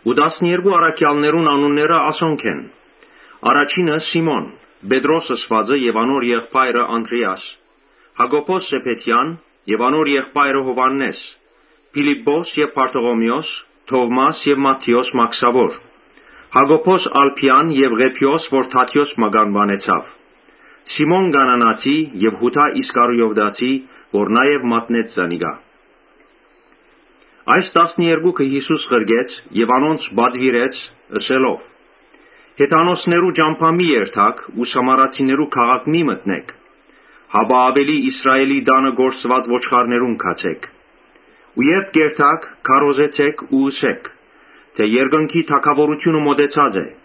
Տասներկու առքեալներուն անունները ասոնք են. առաջինը Սիմոն, Պետրոս ըսուածը եւ անոր եղբայրը Անդրէաս, Յակոբոս Զեբեդեան եւ անոր եղբայրը Յովհաննէս, Փիլիպպոս եւ Բարթողիմէոս, Թովմաս եւ Մատթէոս մաքսաւոր, Յակոբոս Ալփեան եւ Ղեբէոս որ Թադէոս մականուանեցաւ, Սիմոն Կանանացի եւ Յուդա Իսկարիովտացի, որ մատնեց զանիկա։ Յիսուս այս տասներկուքը ղրկեց եւ անոնց պատուիրեց՝ ըսելով. «Հեթանոսներու ճամբայ մի երթաք ու Սամարացիներու քաղաք մի մտնէք, Հապա աւելի Իսրայէլի տանը կորսուած ոչխարներուն գացէք։ Ու երբ կ’երթաք, քարոզեցէք ու ըսէք. ‘Երկնքի թագաւորութիւնը մօտեցած է’։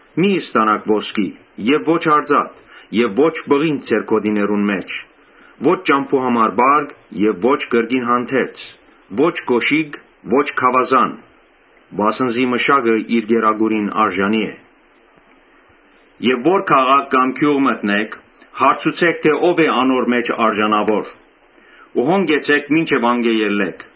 Մի՛ ստանաք ոսկի եւ ո՛չ արծաթ եւ ո՛չ պղինձ ձեր գօտիներուն մէջ։ Ո՛չ ճամբու համար պարկ եւ ո՛չ կրկին հանդերձ, ո՛չ կօշիկ, ո՛չ գաւազան. վասն զի մշակը իր կերակուրին արժանի է։ Երբ քաղաք մը կամ գիւղ մը մտնէք, հարցուցէք թէ ո՞վ է անոր մէջ արժանաւորը ու անոր քով կեցէք մինչեւ անկէ ելլէք։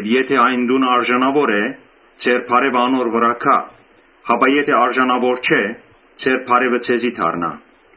Եթէ այն տունը արժանաւոր է, ձեր բարեւը անոր վրայ ըլլայ, իսկ եթէ արժանաւոր չէ, ձեր բարեւը ձեզի դառնայ։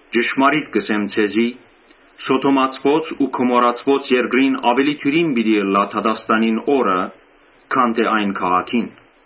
Ճշմարիտ կ’ըսեմ ձեզի, Սոդոմացիներուն ու Գոմորացիներուն երկրին աւելի դիւրին պիտի ըլլայ դատաստանին օրը քան թէ այն քաղաքին»։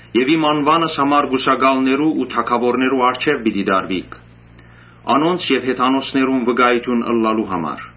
Եւ իմ անուանս համար կուսակալներու ու թագաւորներու առջեւ պիտի տարուիք, անոնց եւ հեթանոսներուն վկայութիւն ըլլալու համար։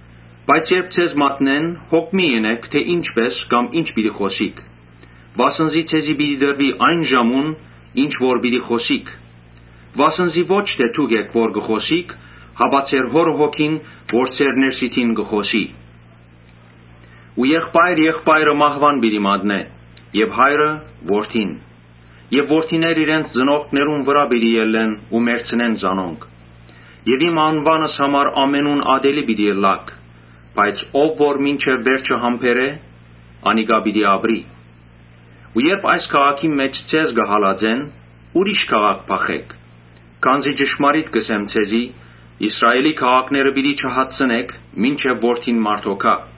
Բայց երբ ձեզ մատնեն, հոգ մի՛ ընէք թէ ինչպէ՛ս կամ ի՛նչ պիտի խօսիք, վասն զի ձեզի պիտի տրուի այն ժամուն՝ ինչ որ պիտի խօսիք։ Վասն զի ո՛չ թէ դուք էք որ պիտի խօսիք, հապա ձեր Հօրը Հոգին՝ որ ձեր ներսիդին կը խօսի։ Եղբայրը իր եղբայրը մահուան պիտի մատնէ եւ հայրը՝ որդին. եւ որդիներ իրենց ծնողքներուն վրայ պիտի ելլեն ու մեռցնեն զանոնք։ Իմ անուանս համար ամենուն ատելի պիտի ըլլաք. բայց ով որ մինչեւ վերջը համբերէ, անիկա պիտի ապրի։ Երբ այս քաղաքին մէջ ձեզ հալածեն, ուրիշ քաղաք փախէք, քանզի ճշմարիտ կ’ըսեմ ձեզի, Իսրայէլի քաղաքները պիտի չհատցնէք, մինչեւ Որդին մարդոյ գայ։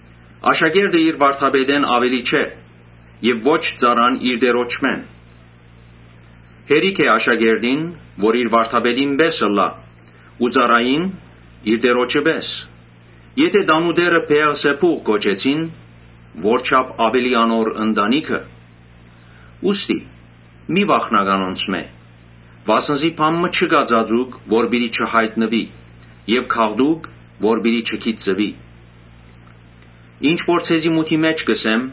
Աշակերտը իր վարդապետէն աւելի չէ եւ ոչ ծառան՝ իր տիրոջմէն։ Հերիք է աշակերտին՝ որ իր վարդապետին պէս ըլլայ ու ծառային՝ իր տիրոջը պէս։ Եթէ տանտէրը Բէեղզեբուղ կոչեցին, ո՜րչափ աւելի անոր ընտանիքը։ Ուստի մի՛ վախնաք անոնցմէ, վասն զի բան մը չկայ ծածուկ որ պիտի չյայտնուի եւ գաղտուկ՝ որ պիտի չգիտցուի։ Ինչ որ ձեզի մութի մէջ կ’ըսեմ,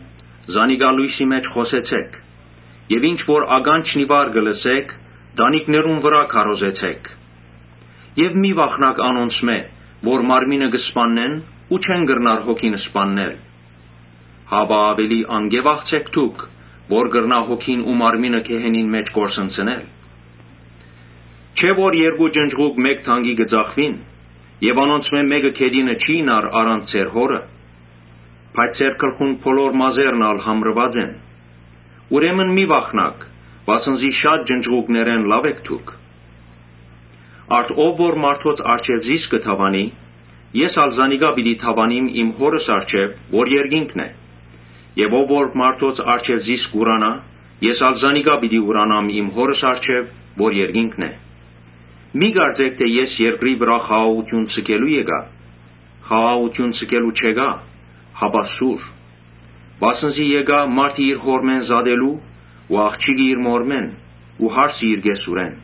զանիկա լոյսի մէջ խօսեցէք եւ ինչ որ ականջն ի վար կը լսէք, տանիքներուն վրայ քարոզեցէք։ Մի՛ վախնաք անոնցմէ՝ որ մարմինը կը սպաննեն ու չեն կրնար հոգին սպաննել. հապա աւելի անկէ վախցէք, որ կրնայ հոգին ու մարմինը գեհենին մէջ կորսնցնել։ Չէ՞ որ երկու ճնճղուկ մէկ դանկի կը ծախուին եւ անոնցմէ մէկը գետինը չիյնար առանց ձեր Հօրը հրամանին։ Բայց ձեր գլխուն բոլոր մազերն ալ համրուած են։ Ուրեմն մի՛ վախնաք, վասն զի շատ ճնճղուկներէ լաւ էք դուք։ Ա՛րդ՝ ով որ մարդոց առջեւ զիս կը դաւանի, ես ալ զանիկա պիտի դաւանիմ Հօրս առջեւ՝ որ երկինքն է։ Եւ ով որ մարդոց առջեւ զիս կ’ուրանայ, ես ալ զանիկա պիտի ուրանամ իմ Հօրս առջեւ՝ որ երկինքն է։ «Մի՛ կարծէք թէ ես երկրի վրայ խաղաղութիւն ձգելու եկայ։ Խաղաղութիւն ձգելու չեկայ, հապա՝ սուր։ Վասն զի եկայ տղան իր հօրմէն զատելու ու աղջիկը՝ իր մօրմէն ու հարսը՝ կեսուրէն։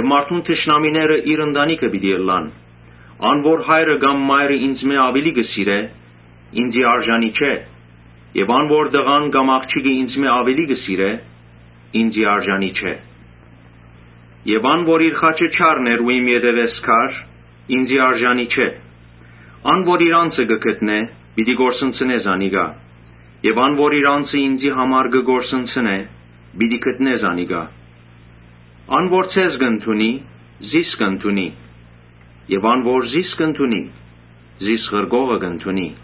Մարդուն թշնամիները իր ընտանիքը պիտի ըլլան։ Ան որ հայրը կամ մայրը ինծմէ աւելի կը սիրէ, ինծի արժանի չէ եւ ան որ տղան կամ աղջիկը ինծմէ աւելի կը սիրէ, ինծի արժանի չէ։ Ան որ իր խաչը չառներ ու իմ ետեւէս գար, ինծի արժանի չէ։ Ան որ իր անձը կը գտնէ, պիտի կորսնցնէ զանիկա եւ ան որ իր անձը ինծի համար կը կորսնցնէ, պիտի գտնէ զանիկա։ «Ան որ ձեզ կ’ընդունի, զիս կ’ընդունի. եւ ան որ զիս կ’ընդունի, զիս ղրկողը կ’ընդունի։